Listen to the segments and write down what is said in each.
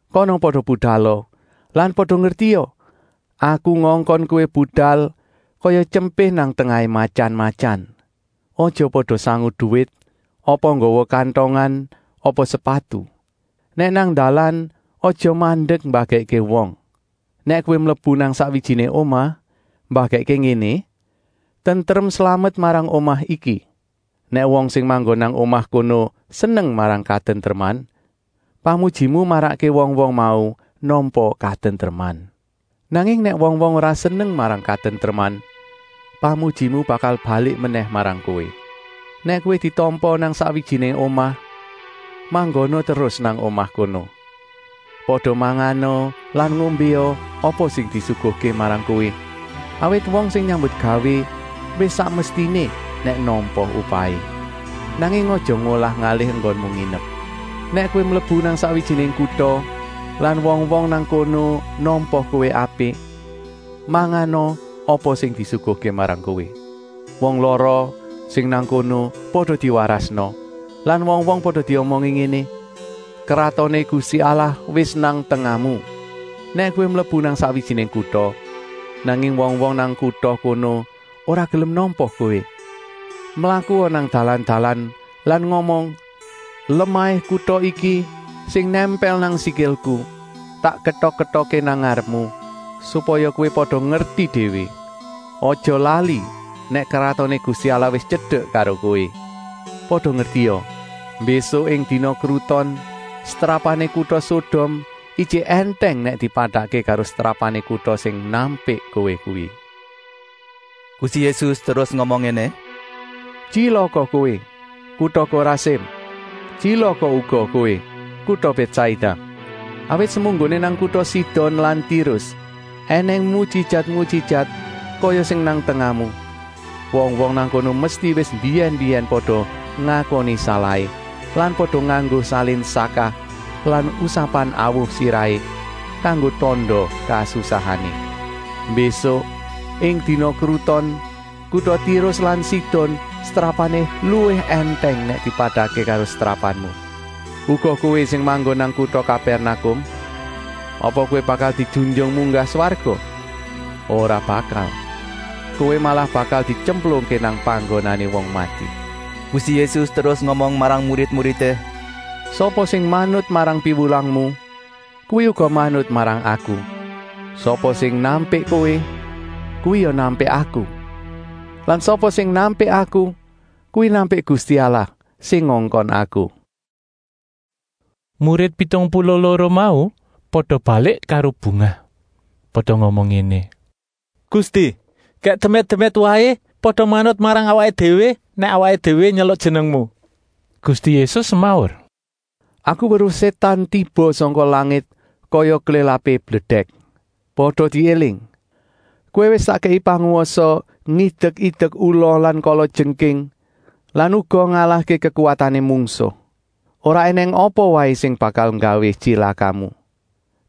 Kana pada budala lan pada ngertia: Aku ngongkon kowé budal kaya tyempé nang tengahé matyan-matyan. Aja pada sangu duwit apa nggawa kantongan apa sepatu. Nèk nang dalan aja mandek mbagèkké wong. Nèk kowé mlebu nang sakwijiné omah, mbagèkké ngéné: ‘Tentrem-slamet marang omah iki.’ Nèk wong sing manggon nang omah kono seneng marang katentreman, pamujimu marakké wong-wong mau nampa katentreman. Nanging nèk wong-wong ora seneng marang katentreman, pamujimu bakal balik menèh marang kowé. Nèk kowé ditampa nang sakwijiné omah, manggona terus nang omah kono. Pada mangana lan ngombéa apa sing disuguhké marang kowé, awit wong sing nyambutgawé wis sak mestiné nèk nampa upahé. Nanging aja ngolah-ngalih enggonmu nginep. Nèk kowé mlebu nang sakwijiné kuta lan wong-wong nang kono nampa kowé apik, mangana apa sing disuguhké marang kowé. Wong lara sing nang kono pada diwarasna lan wong-wong pada diomongi ngéné: ‘Kratoné Gusti Allah wis nang tengahmu.’ Nèk kowé mlebu nang sakwijiné kuta, nanging wong-wong nang kuta kono ora gelem nampa kowé, mlakua nang dalan-dalan lan ngomong: ‘Lemahé kuta iki, sing nèmpèl nang sikilku, tak ketok-ketokké nang ngarepmu, supaya kowé pada ngerti déwé. Aja lali nèk Kratoné Gusti Allah wis tyedek karo kowé.’ Pada ngertia, mbésuk ing dina kruton setrapané kuta Sodom ijik èntèng nèk dipadakké karo setrapané kuta sing nampik kowé kuwi.” Gusti Yésus terus ngomong ngéné: “Tyilaka kowé, kuta Korasim! Tyilaka uga kowé, kuta Bètsaida! Awit semunggoné nang kuta Sidon lan Tirus ènèng mujijat-mujijat kaya sing nang tengahmu, wong-wong nang kono mesti wis mbiyèn-mbiyèn pada ngakoni salahé lan pada nganggo salin sakah lan usapan awu sirahé kanggo tanda kasusahané. Mbésuk ing dina kruton kuta Tirus lan Sidon setrapané luwih èntèng nèk dipadakké karo setrapanmu. Uga kowé sing manggon nang kuta Kapèrnakum! Apa kowé bakal dijunjung munggah swarga? Ora bakal! Kowé malah bakal dityemplungké nang panggonané wong mati.” Gusti Yésus terus ngomong marang murid-muridé: “Sapa sing manut marang piwulangmu, kuwi uga manut marang Aku. Sapa sing nampik kowé, kuwi ya nampik Aku. Lan sapa sing nampik Aku, kuwi nampik Gusti Allah sing ngongkon Aku!” Murid pitung puluh loro mau pada balik karo bungah. Pada ngomong ngéné: “Gusti, gèk demit-demit waé pada manut marang awaké déwé nèk awaké déwé nyeluk Jenengmu.” Gusti Yésus semaur: “Aku weruh Sétan tiba sangka langit kaya klélapé bledèk. Pada diéling! Kowé wis tak kèki pangwasa ngidek-idek ula lan kalajengking lan uga ngalahké kekuwatané mungsuh. Ora ènèng apa waé sing bakal nggawé tyilakamu.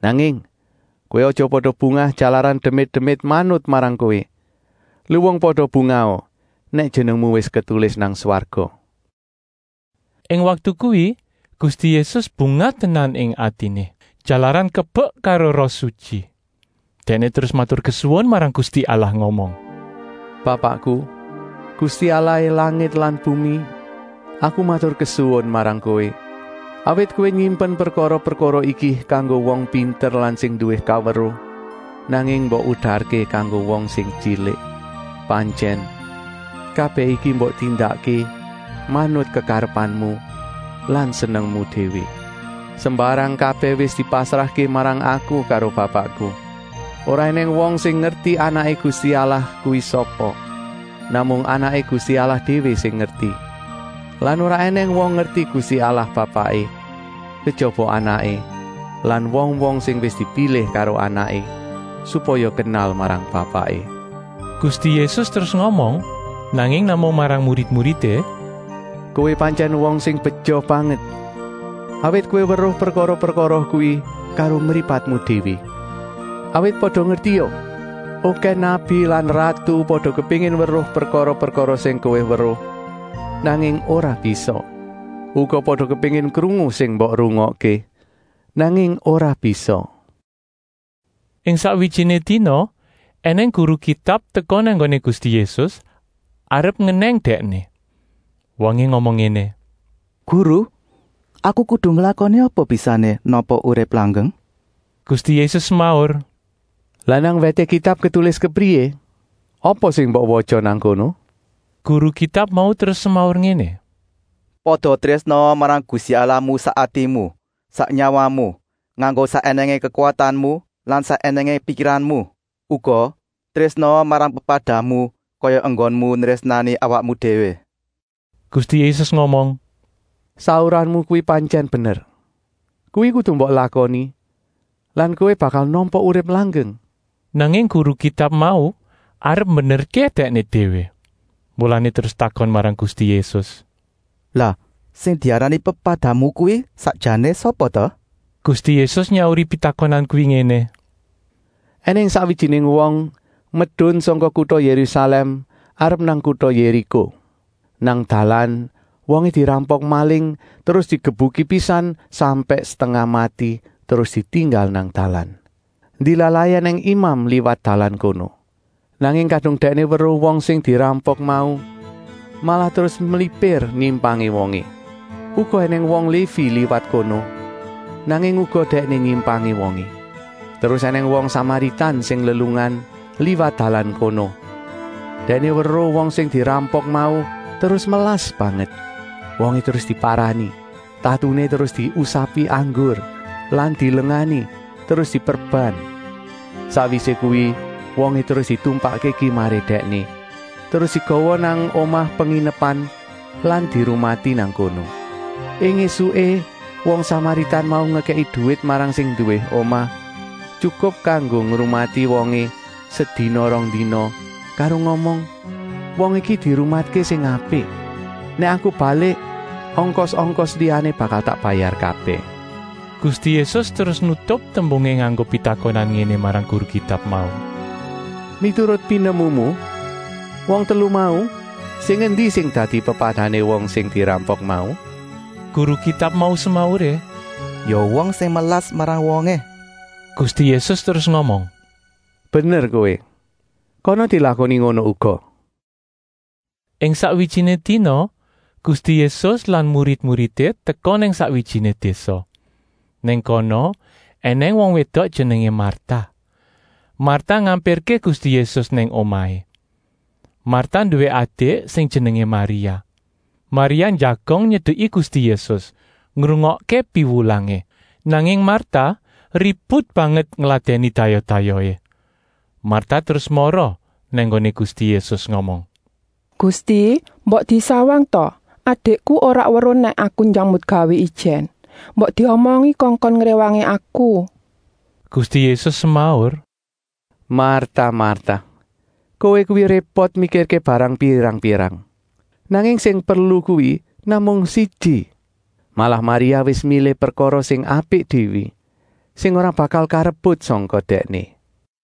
Nanging, kowé aja pada bungah jalaran demit-demit manut marang kowé, luwung pada bungaha nèk jenengmu wis ketulis nang swarga.” Ing waktu kuwi Gusti Yésus bungah tenan ing atiné, jalaran kebek karo Roh Sutyi. Dèkné terus maturkesuwun marang Gusti Allah ngomong: “Bapakku, Gusti Allahé langit lan bumi, Aku maturkesuwun marang Kowé, awit Kowé nyimpen prekara-prekara iki kanggo wong pinter lan sing nduwé kaweruh, nanging mbok udarké kanggo wong sing tyilik. Pantyèn, kabèh iki mbok tindakké manut kekarepanmu lan senengmu déwé. “Sembarang kabèh wis dipasrahké marang Aku karo Bapakku. Ora ènèng wong sing ngerti Anaké Gusti Allah kuwi sapa, namung Anaké Gusti Allah déwé sing ngerti lan ora ènèng wong ngerti Gusti Allah Bapaké, kejaba Anaké lan wong-wong sing wis dipilih karo Anaké supaya kenal marang Bapaké.” Gusti Yésus terus ngomong, nanging namung marang murid-murid: “Kowé pantyèn wong sing beja banget, awit kowé weruh prekara-prekara kuwi karo mripatmu déwé. Awit pada ngertia: okèh nabi lan ratu pada kepéngin weruh prekara-prekara sing kowé weruh, nanging ora bisa. Uga pada kepéngin krungu sing mbok rungokké, nanging ora bisa.” Ing sakwijiné dina ènèng guru Kitab teka nang nggoné Gusti Yésus arep ngenèng Dèkné. Wongé ngomong ngéné: “Guru, aku kudu nglakoni apa bisané nampa urip langgeng?” Gusti Yésus semaur: “Lah nang wèté Kitab ketulis kepriyé? Apa sing mbok watya nang kono?” Guru Kitab mau terus semaur ngéné: “Pada trésnaa marang Gusti Allahmu sak atimu, sak nyawamu, nganggo sak ènèngé kekuwatanmu lan sak ènèngé pikiranmu. Uga, trésnaa marang pepadamu kaya enggonmu nrésnani awakmu déwé.” Gusti Yésus ngomong: “Sauranmu kuwi pantyèn bener. Kuwi kudu mbok lakoni lan kowé bakal nampa urip langgeng.” Nanging guru Kitab mau arep mbenerké dèkné déwé, mulané terus takon marang Gusti Yésus: “Lah sing diarani pepadamu kuwi sakjané sapa ta?” Gusti Yésus nyauri pitakonan kuwi ngéné: “Enèng sakwijiné wong medun sangka kuta Yérusalèm arep nang kuta Yériko. Nang dalan wongé dirampok maling terus digebuki pisan sampèk setengah mati terus ditinggal nang dalan. Ndilalahé ènèng imam liwat dalan kono. Nanging kadung dèkné weruh wong sing dirampok mau, malah terus mlipir nyimpangi wongé. Uga ènèng wong Lévi liwat kono, nanging uga dèkné nyimpangé wongé. Terus ènèng wong Samaritan sing lelungan, liwat dalan kono. Dèkné weruh wong sing dirampok mau terus melas banget. Wongé terus diparani, tatuné terus diusapi anggur lan dilengani, terus diperban. Sakwisé kuwi wongé terus ditumpakké kimaré dèkné, terus digawa nang omah penginepan lan dirumati nang kono. Ing ésuké wong Samaritan mau ngekèki duwit marang sing nduwé omah, tyukup kanggo ngrumati wongé sedina-rongdina, karo ngomong: ‘Wong iki dirumatké sing apik. Nèk aku balik ongkos-ongkos liyané bakal tak bayar kabèh.’” Gusti Yésus terus nutup tembungé nganggo pitakonan ngéné marang guru Kitab mau: “Miturut pinemumu, wong telu mau, sing endi sing dadi pepadané wong sing dirampok mau?” Guru Kitab mau semauré: “Ya wong sing melas marang wongé!” Gusti Yésus terus ngomong: “Bener kowé, kana dilakoni ngono uga!” Ing sakwijiné dina Gusti Yésus lan murid-muridé teka nang sakwijiné désa. Nang kono ènèng wong wédok jenengé Marta. Marta ngampirké Gusti Yésus nang omahé. Marta nduwé adik sing jenengé Maria. Maria njagong nyedeki Gusti Yésus, ngrungokké piwulangé. Nanging Marta ribut banget ngladèni dayoh-dayohé. Marta terus mara nang nggoné Gusti Yésus ngomong: “Gusti, mbok disawang ta! Adikku ora weruh nèk aku nyambutgawé ijèn. Mbok diomongi kongkon ngréwangi aku!” Gusti Yésus semaur: “Marta, Marta! Kowé kuwi répot mikirké barang pirang-pirang. Nanging sing perlu kuwi namung siji. Malah Maria wis milih prekara sing apik déwé, sing ora bakal karebut sangka dèkné!”